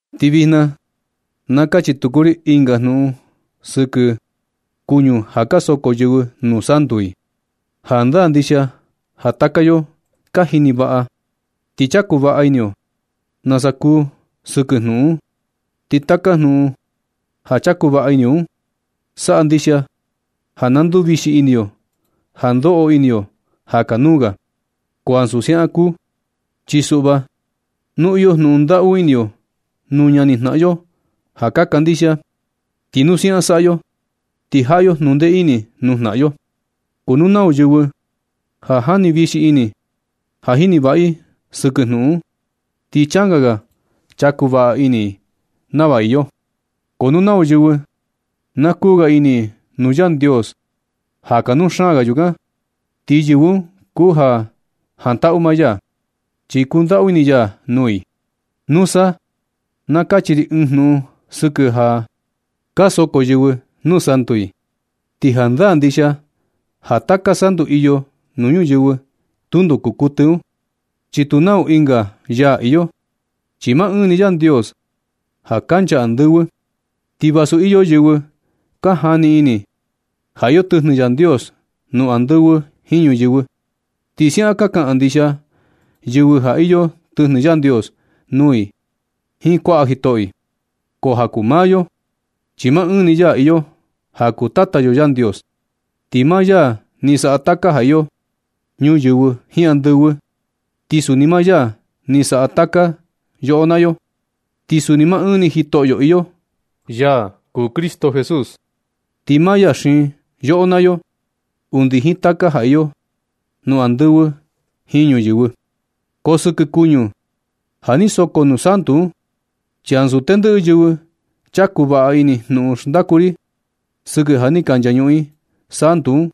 Ti vijna na kachi tuku ri ɨnga jnuꞌun sɨkɨ kuñu ja ka soko yɨvɨ nuu santu i. Jandaa ndixia ja taka yo ka jini vaꞌa, ti chaku vaꞌa ini yo nasa kuu sɨkɨ jnuꞌun un. Ti taka jnuꞌun ja chaku vaꞌa ini yo un, saꞌa ndixia ja na nduvixi ini yo ja ndoꞌo ini yo ja kanuu ga. Ko ansu siaꞌan kuu, chi suꞌva nu iyo jnuꞌun ndaꞌu ini yo nuu ñani jnaꞌan yo ja kandixia, ti nu siaꞌan saꞌa yo, ti jaꞌa yo nundee ini nuu jnaꞌan yo. Ko nu nau yɨvɨ ja jani vixi ini ja jini vaꞌa i sɨkɨ jnuꞌun un, ti changa ga chaku vaꞌa ini i nava iyo. Ko nu nau yɨvɨ na kuu ga ini nuu Yandios ja kanuu xaan ga yukan, ti yɨvɨ un kuu ja jantaꞌu maa ya, chi kundaꞌu ini ya nuu i. Nusa na kachi ri ɨɨn jnuꞌun sɨkɨ ja ka soko yɨvɨ nuu santu i. Ti jandaa ndixia ja taka santu iyo nuu ñuyɨvɨ, tundo kuu kuɨtɨ un, chi tu nau ɨnga yaa iyo, chi maa ɨɨn ni Yandios ja kancha andɨvɨ. Ti vasu iyo yɨvɨ ka jani ini ja iyo tɨjnɨ Yandios nuu andɨvɨ jiin ñuyɨvɨ, ti siaꞌan ka kaꞌan ndixia yɨvɨ ja iyo tɨjnɨ Yandios nuu i jiin kuaꞌa jitoꞌo i. Ko ja kuu nuu maa yo, chi maa ɨɨn ni Yaa iyo ja kuu Tata yo Yandios. Ti maa ya ni saꞌa taka ja iyo ñuyɨvɨ jiin andɨvɨ, ti suni maa ya ni saꞌa taka yoꞌo naa yo. Ti suni maa ɨɨn ni Jitoꞌyo iyo, ya kuu Cristo Jesús. Ti maa ya xiin yoꞌo naa yo undi jiin taka ja iyo nuu andɨvɨ jiin ñuyɨvɨ. Ko sɨkɨ kuñu ja ni soko nuu santu un, chi ansu tendɨꞌɨ yɨvɨ chaku vaꞌa ini jnuꞌun xndaku ri sɨkɨ ja ni ka nchañuꞌun i santu un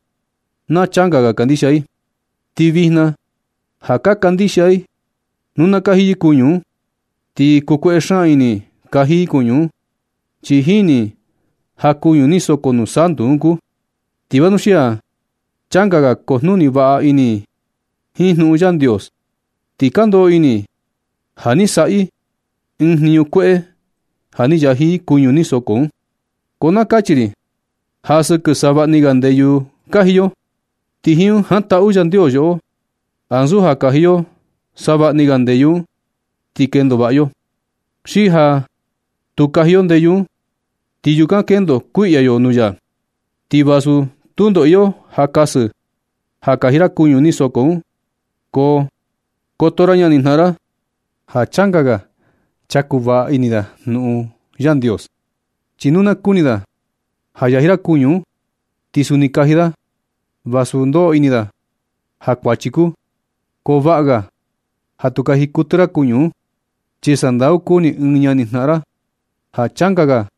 na changa ga kandixia i. Ti vijna ja ka kandixia i nu na kaji yɨ kuñu un, ti kukueꞌe xaan ini i kaji i kuñu un, chi jini i ja kuñu ni soko nuu santu un kuu. Ti vanuxia changa ga kujnuni vaꞌa ini i jiin jnuꞌun Yandios, ti ka ndoꞌo ini i ja ni saꞌa i ɨɨn jniñu kueꞌe ja ni yaji i kuñu ni soko un. Ko na kachi ri ja sɨkɨ savaꞌni ga ndeyu kaji yo, ti jiin un jantaꞌu Yandios yoꞌo, ansu ja kaji yo savaꞌni ga ndeyu un ti kendo vaꞌa yo. Xi ja tu kaji yo ndeyu un, ti yukan kendo kuiꞌya yo nuu ya. Ti vasu tundo iyo ja kasɨ ja kaji ra kuñu ni soko un, ko koto ra ñanijnaꞌan ra, ja changa ga chaku vaꞌa ini da jnuꞌun Yandios. Chi nu na kuni da ja yaji ra kuñu un, ti suni kaji da, vasu ndoꞌo ini da ja kuachi kuu. Ko vaꞌa ga ja tu kaji kuɨtɨ ra kuñu un, chi sandau kuni ɨɨn ñani jnaꞌan ra ja changa ga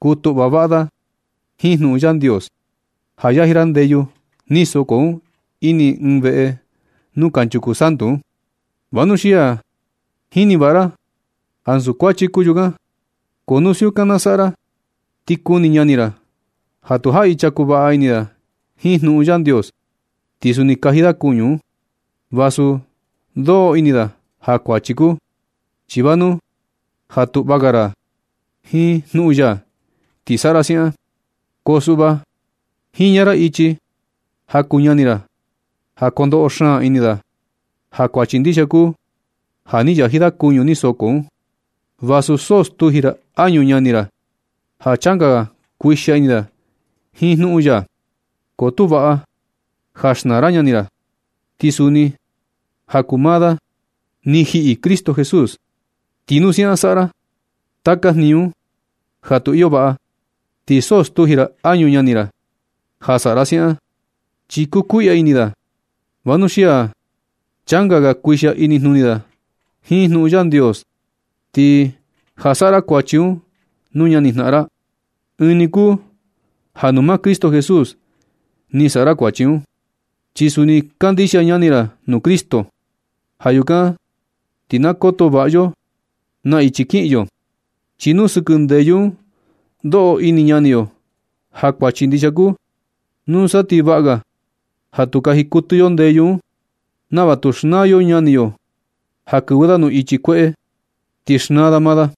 kutuꞌva vaꞌa da jiin jnuꞌun Yandios, ja yaji ra ndeyu ni soko un ini ɨɨn veꞌe nuu kanchuku santu un, vanuxia jini vaꞌa ra ansu kuachi kuu yukan. Ko nu siukan na saꞌa ra, ti kuni ñani ra ja tu jaꞌi chaku vaꞌa ini da jiin jnuꞌun Yandios, ti suni kaji da kuñu un, vasu ndoꞌo ini da ja kuachi kuu. Chi vanu ja tuꞌva ga ra jiin jnuꞌun ya ti saꞌa ra siaꞌan, ko suꞌva jiña ra ichi ja kuu ñani ra ja kondoꞌo xaan ini da ja kuachi ndixia kuu ja ni yaji da kuñu ni soko un, vasu so stuji ra añu ñani ra ja changa ga kuixia ini da jiin jnuꞌun ya. Ko tu vaꞌa ja xnaa ra ñani ra, chi suni ja kuu maa da ni jiꞌi Cristo Jesús. Ti nu siaꞌan saꞌa ra taka jniñu un ja tu iyo vaꞌa, ti so stuji ra añu ñani ra ja saꞌa ra siaꞌan, chi kukuiꞌya ini da vanuxia changa ga kuixia inijnuni da jiin jnuꞌun Yandios. Ti ja saꞌa ra kuachi un nuu ñanijnaꞌan ra, ɨɨn ni kuu ja nuu maa Cristo Jesús ni saꞌa ra kuachi un, chi suni kandixia ñani ra nuu Cristo. Ja yukan ti na koto vaꞌa yo naa ichi kiꞌin yo. Chi nu sɨkɨ ndeyu un ndoꞌo ini ñani yo ja kuachi ndixia kuu, nusa ti vaꞌa ga ja tu kaji kuɨtɨ yo ndeyu un, nava tu xnaa yo ñani yo ja kɨvɨ da nuu ichi kueꞌe, ti xnaa da maa da.